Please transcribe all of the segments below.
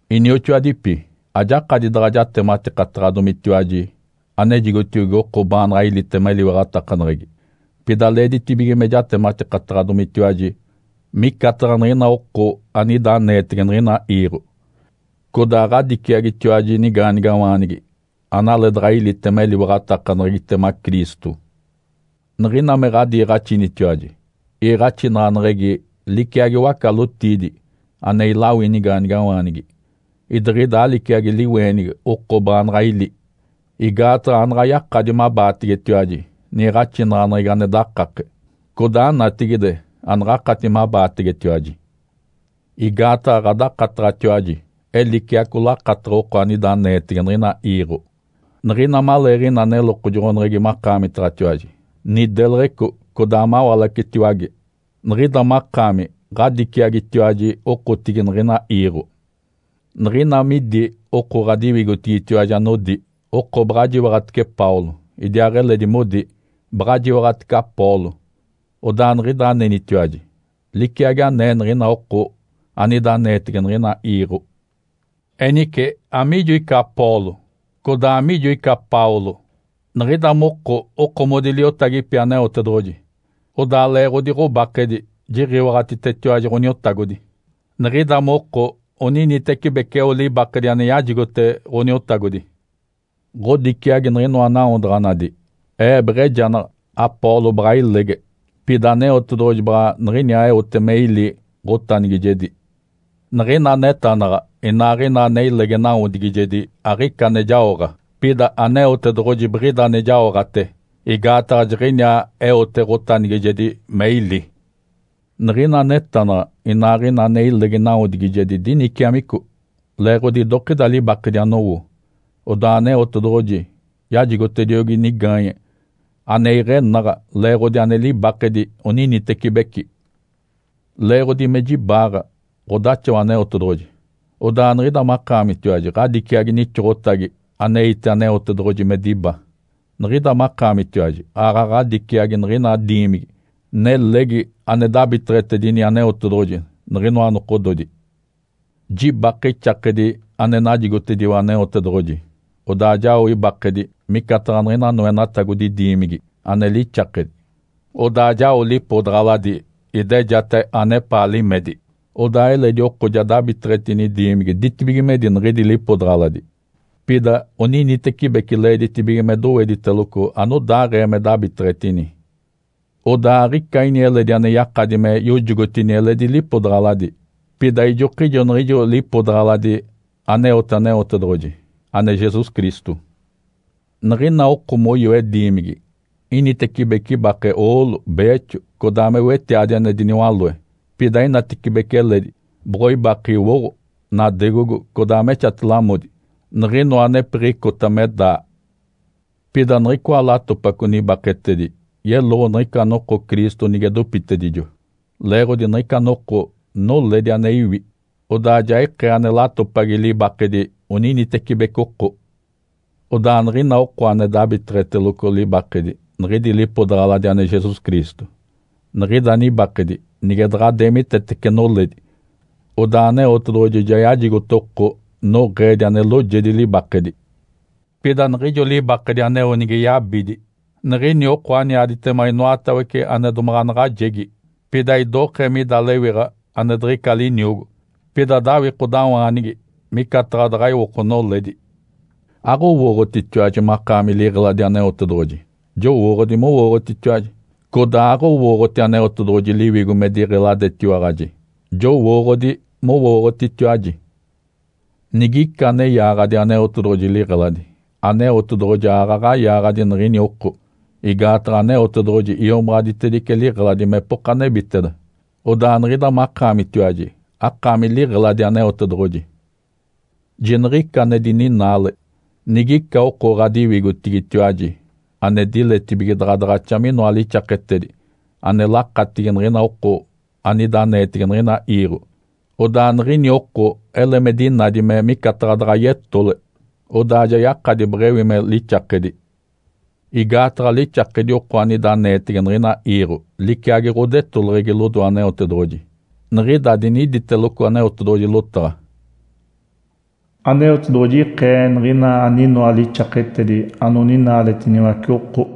Inioxoadipi, ajakadi daɡ̶a jatematikataɡ̶adomitiwaji anejigotiogi oko baanaɡ̶a ilitema eliwaɡ̶atakaneɡ̶egi, pida leeditibige me jatematikataɡ̶adomitiwaji micataɡ̶a niɡ̶ina oko anida aneetege niɡ̶ina iiɡ̶o, codaa ɡ̶adiciagitiwaji nigaanigawaanigi, analeedaɡ̶a ilitema eliwaɡ̶atakaneɡ̶egitema Cristo. Niɡ̶ina me ɡ̶adiiɡ̶axinitiwaji, iiɡ̶axinaɡ̶aneɡ̶egi liciagi waca-lotiidi ane ilawi nigaanigawaanigi, idiɡ̶ida aliciagi liweenigi oko baanaɡ̶a ili, igaataɡ̶a anaɡ̶a yakadi mabaategetiwaji niiɡ̶axinaɡ̶aneɡ̶egi ane dakake, codaa natigide anaɡ̶akati mabaategetiwaji. Igaataɡ̶a ɡ̶adakataɡ̶atiwaji eliciaco lakataɡ̶a oko anida aneetege niɡ̶ina iiɡ̶o. Niɡ̶ina maleeɡ̶ina nelokojoɡ̶oneɡ̶egi makaamitaɡ̶atiwaji, nideleɡ̶eco codaa mawalacetiwage, niɡ̶ida makaami ɡ̶adiciagitiwaji okotigi niɡ̶ina iiɡ̶o. Niɡ̶ina midi oko ɡ̶adiwigotigitiwaji anodi, “Oko baɡ̶a jiwaɡ̶atece Paulo”, idiaaɡ̶eledi modi, “Baɡ̶a jiwaɡ̶atece Apolo”, odaa niɡ̶ida anenitiwaji liciagi anee niɡ̶ina oko anida aneetege niɡ̶ina iiɡ̶o. Enice amiijo ica Apolo? Codaa amiijo ica Paulo? Niɡ̶ida moko okomodi liotagipi Aneotedoɡ̶oji, odaa leeɡ̶odi ɡ̶obakedi jiɡ̶iwaɡ̶atitetiwaji Ǥoniotagodi. Niɡ̶ida moko oninitecibeci eo libakedi ane najigote Ǥoniotagodi. Ǥodiciagi niɡ̶inoa nawodaɡ̶anadi. Ee beɡ̶ejanaɡ̶a, Apolo baɡ̶a ilege, pida Aneotedoɡ̶oji baɡ̶a niɡ̶iniaa eote me ili ɡ̶otanigijedi. Niɡ̶ina anetanaɡ̶a inaaɡ̶ina ane ilege nawodigijedi aɡ̶ica ane jaoɡ̶a, pida Aneotedoɡ̶oji biɡ̶ida ane jaoɡ̶ate, igaataɡ̶a jiɡ̶iniaa eote ɡ̶otanigijedi me ili. Niɡ̶ina anetanaɡ̶a inaaɡ̶ina ane ilege nawodigijedi diniciamico, leeɡ̶odi idokida libakedi anowo. Odaa Aneotedoɡ̶oji yajigotediogi nigaanye ane iɡ̶enaɡ̶a leeɡ̶odi ane libakedi oninitecibeci. Leeɡ̶odi me jibaaɡ̶a ɡ̶odaxawa Aneotedoɡ̶oji, odaa niɡ̶ida makaamitiwaji ɡ̶adiciagi nixoɡ̶otagi aneite Aneotedoɡ̶oji me diba. Niɡ̶ida makaamitiwaji aaɡ̶aɡ̶a ɡ̶adiciagi niɡ̶ina diimigi nelegi ane dabiteɡ̶etedini Aneotedoɡ̶oji niɡ̶inoa nokododi. Jibake ixakedi ane najigotediwa Aneotedoɡ̶oji, odaa jao ibakedi micataɡ̶a niɡ̶ina noenatagodi diimigi ane lixakedi. Odaa jao lipodaɡ̶aladi idejate anepaa limedi, odaa eledi oko ja dabiteɡ̶etini diimigi ditibigimedi niɡ̶idi lipodaɡ̶aladi. Pida oninitecibeci leeditibige me dowediteloco anodaaɡ̶ee me dabiteɡ̶etini. Odaa aɡ̶ica ini eledi ane yakadi me yojogotini eledi lipodaɡ̶aladi, pida ijokijo niɡ̶ijo lipodaɡ̶aladi aneote Aneotedoɡ̶oji, ane Jesus Cristo. Niɡ̶ina oko moyoe diimigi, initecibece ibake oolo, beexo, codaa me wetiadi ane diniwaloe, pida inatecibece eledi boɡ̶oibake iwoɡ̶o, nadegogo, codaa me exate-lamodi, niɡ̶inoa anepiɡ̶icota me daa. Pida niɡ̶icoa latopaco nibaketedi yeloɡ̶o niɡ̶ica noko Cristo nige dopitedijo. Leeɡ̶odi niɡ̶ica noko noledi ane iwi, odaa ja ikee ane latopagi libakedi oninitecibeci oko. Odaa niɡ̶ina oko ane dabiteɡ̶eteloco libakedi niɡ̶idi lipodaɡ̶aladi ane Jesus Cristo, niɡ̶ida nibakedi nige daɡ̶a deemitetece noledi, odaa Aneotedoɡ̶oji ja yajigote oko noɡ̶eedi ane loojedi libakedi. Pida niɡ̶ijo libakedi aneo nige yabidi, niɡ̶ini oko aniaditema inoatawece ane domaɡ̶a naɡ̶ajegi. Pida idokee mida lewiɡ̶a ane diɡ̶ica liniogo, pida dawikodawaanigi micataɡ̶a daɡ̶a iwoko noledi. Aɡ̶owooɡ̶otitiwaji makaami liɡ̶eladi Aneotedoɡ̶oji? Jowooɡ̶odi mowooɡ̶otitiwaji! Codaa aɡ̶owooɡ̶oti Aneotedoɡ̶oji Liwigo me diɡ̶eladetiwaɡ̶aji? Jowooɡ̶odi mowooɡ̶otitiwaji! Nigica ane yaaɡ̶adi Aneotedoɡ̶oji liɡ̶eladi, Aneotedoɡ̶oji aaɡ̶aɡ̶a yaaɡ̶adi niɡ̶ini oko. Igaataɡ̶a Aneotedoɡ̶oji iomaɡ̶aditedice liɡ̶eladi mepoka nebiteda, odaa niɡ̶ida makaamitiwaji akaami liɡ̶eladi Aneotedoɡ̶oji. Jiniɡ̶ica ane dininaale! Nigica oko ɡ̶adiwigotigitiwaji ane diletibige daɡ̶a daɡ̶axa minoa lixaketedi ane lakatigi niɡ̶ina oko anida aneetege niɡ̶ina iiɡ̶o, odaa niɡ̶ini oko ele me dinadi me micataɡ̶a daɡ̶a yetole, odaa ja yakadi beɡ̶ewi me lixakedi. Igaataɡ̶a lixakedi oko anida aneetege niɡ̶ina iiɡ̶o liciagi ɡ̶odetoleɡ̶egi lodoe Aneotedoɡ̶oji. Niɡ̶ida diniditeloco Aneotedoɡ̶oji lotaɡ̶a, “Aneotedoɡ̶oji iɡ̶eke niɡ̶ina aninoa lixaketedi anoninaaletiniwace oko.”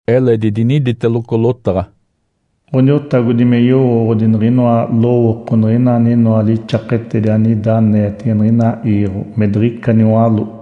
Eledi diniditeloco lotaɡ̶a, “Ǥoniotagodi me yowooɡ̶odi niɡ̶inoa lowooko niɡ̶ina aninoa lixaketedi anida aneetege niɡ̶ina iiɡ̶o me diɡ̶ica niwaló.”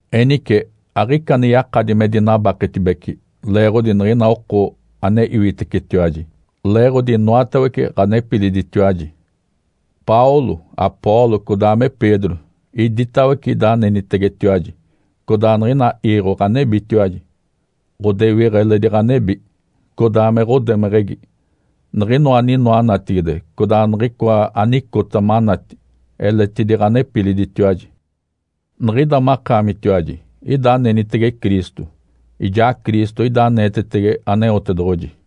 Enice aɡ̶ica ane yakadi me dinabaketibece leeɡ̶odi niɡ̶ina oko ane iwitecetiwaji! Leeɡ̶odi inoatawece ɡ̶anepiliditiwaji. Paulo, Apolo, codaa me Pedro iditawece ida anenitegetiwaji. Codaa niɡ̶ina iiɡ̶o ɡ̶anebitiwaji, ɡ̶odewiɡ̶a eledi ɡ̶anebi, codaa me ɡ̶odemeɡ̶egi. Niɡ̶inoa aninoa natigide, codaa niɡ̶icoa anicota manati, eletidi ɡ̶anepiliditiwaji. Niɡ̶ida makaamitiwaji ida anenitege Cristo, ijaa Cristo ida aneetetege Aneotedoɡ̶oji.